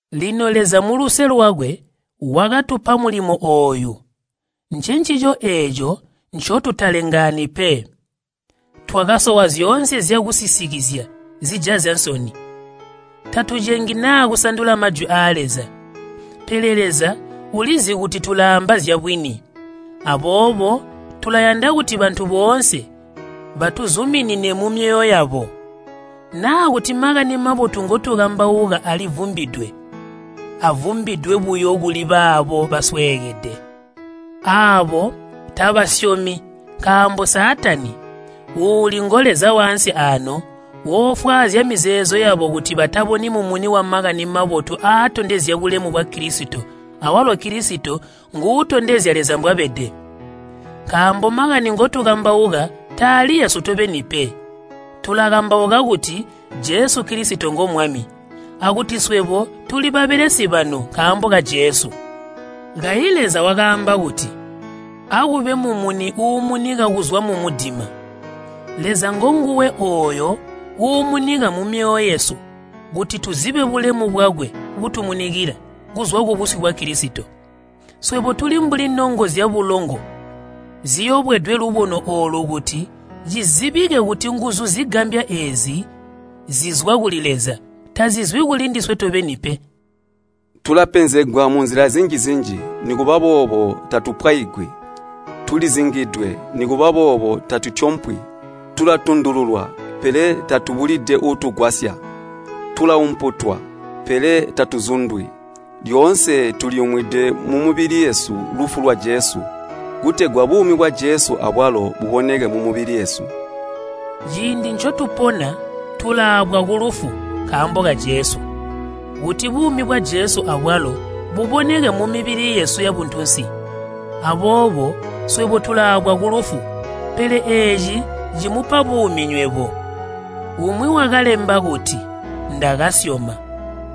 Lino Leza muluse lwakwe wakatupa mulimo ooyu, ncencico eeco ncotutalengaani pe. Twakasowa zyoonse zyakusisikizya zijazya nsoni. Tatucengi naa kusandula Majwi aa Leza, pele Leza ulizi kuti tulaamba zyabwini. Aboobo tulayanda kuti bantu boonse batuzuminine mumyoyo yabo. Naa kuti Makani Mabotu ngotukambauka alivumbidwe, avumbidwe buyo kuli baabo basweekede. Aabo tabasyomi nkaambo Saatani uuli ngoleza waansi aano woofwaazya mizeezo yabo kuti bataboni mumuni wa Makani Mabotu aatondezya bulemu bwa Kilisito awalo Kilisito nguutondezya Leza mbwabede. Nkaambo makani ngotukambauka taali eesu tobeni pe, tulakambauka kuti Jesu Kilisito ngo Mwami, akuti swebo tuli babelesi banu nkaambo ka Jesu. Kayi Leza wakaamba kuti, “Akube mumuni uumunika kuzwa mumudima.” Leza ngonguwe ooyo uumunika mumyoyo yesu kuti tuzibe bulemu bwakwe butumunikila kuzwa kubusyu bwa Kilisito. Swebo tuli mbuli nongo zyabulongo ziyobwedwe lubono oolu kuti Cizibike kuti nguzu zigambya eezi zizwa kuli Leza, tazizwi kulindiswe tobeni pe. Tulapenzegwa munzila zinji-zinji, nikuba boobo tatupwaigwi. Tulizingidwe, nikuba boobo tatutyompwi. Tulatundululwa, pele tatubulide uutugwasya. Tulaumputwa, pele tatuzundwi. Lyoonse tuliyumwide mumibili yesu lufu lwa Jesu, kutegwa buumi bwa Jesu abwalo buboneke mumibili yesu. Ciindi ncotupona tulaabwa kulufu nkaambo ka Jesu, kuti buumi bwa Jesu abwalo buboneke mumibili yesu yabuntunsi. Aboobo swebo tulaabwa kulufu, pele eeci cimupa buumi nywebo. Umwi wakalemba kuti, “Ndakasyoma,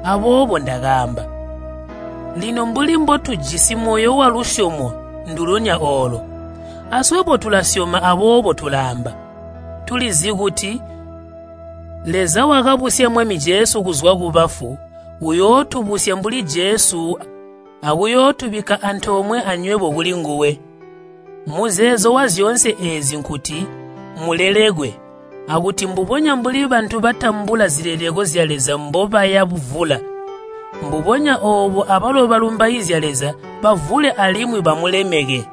aboobo ndakaamba.” Lino mbuli mbotujisi moyo walusyomo ndulonya oolo, aswebo tulasyoma aboobo tulaamba. Tulizi kuti Leza wakabusya Mwami Jesu kuzwa kubafu, uyootubusya mbuli Jesu akuyootubikka antoomwe anywebo kulinguwe. Muzeezo wazyoonse eezi nkuti mulelekwe, akuti mbubonya mbuli bantu batambula zileleko zya Leza mbobaya buvula, mbubonya oobo abalo balumbaizya Leza bavule alimwi bamulemeke.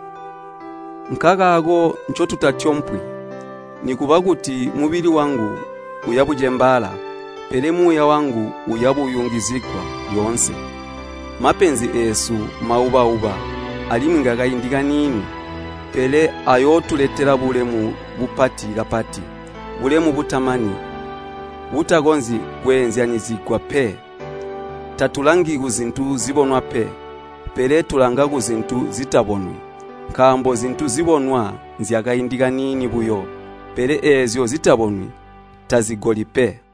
Nkankakaako ncotutatyompwi. Nikuba kuti mubili wangu uyabucembaala, pele muuya wangu uyabuyungizigwa lyoonse. Mapenzi eesu mauba-uba alimwi ngakaindi kaniini, pele ayootuletela bulemu bupati kapati, bulemu butamani, butakonzyi kweezyanyizigwa pe. Tatulangi kuzintu zibonwa pe, pele tulanga kuzintu zitabonwi. Nkaambo zintu zibonwa nzyakaindi kaiini buyo, pele eezyo zitabonwi tazigoli pe.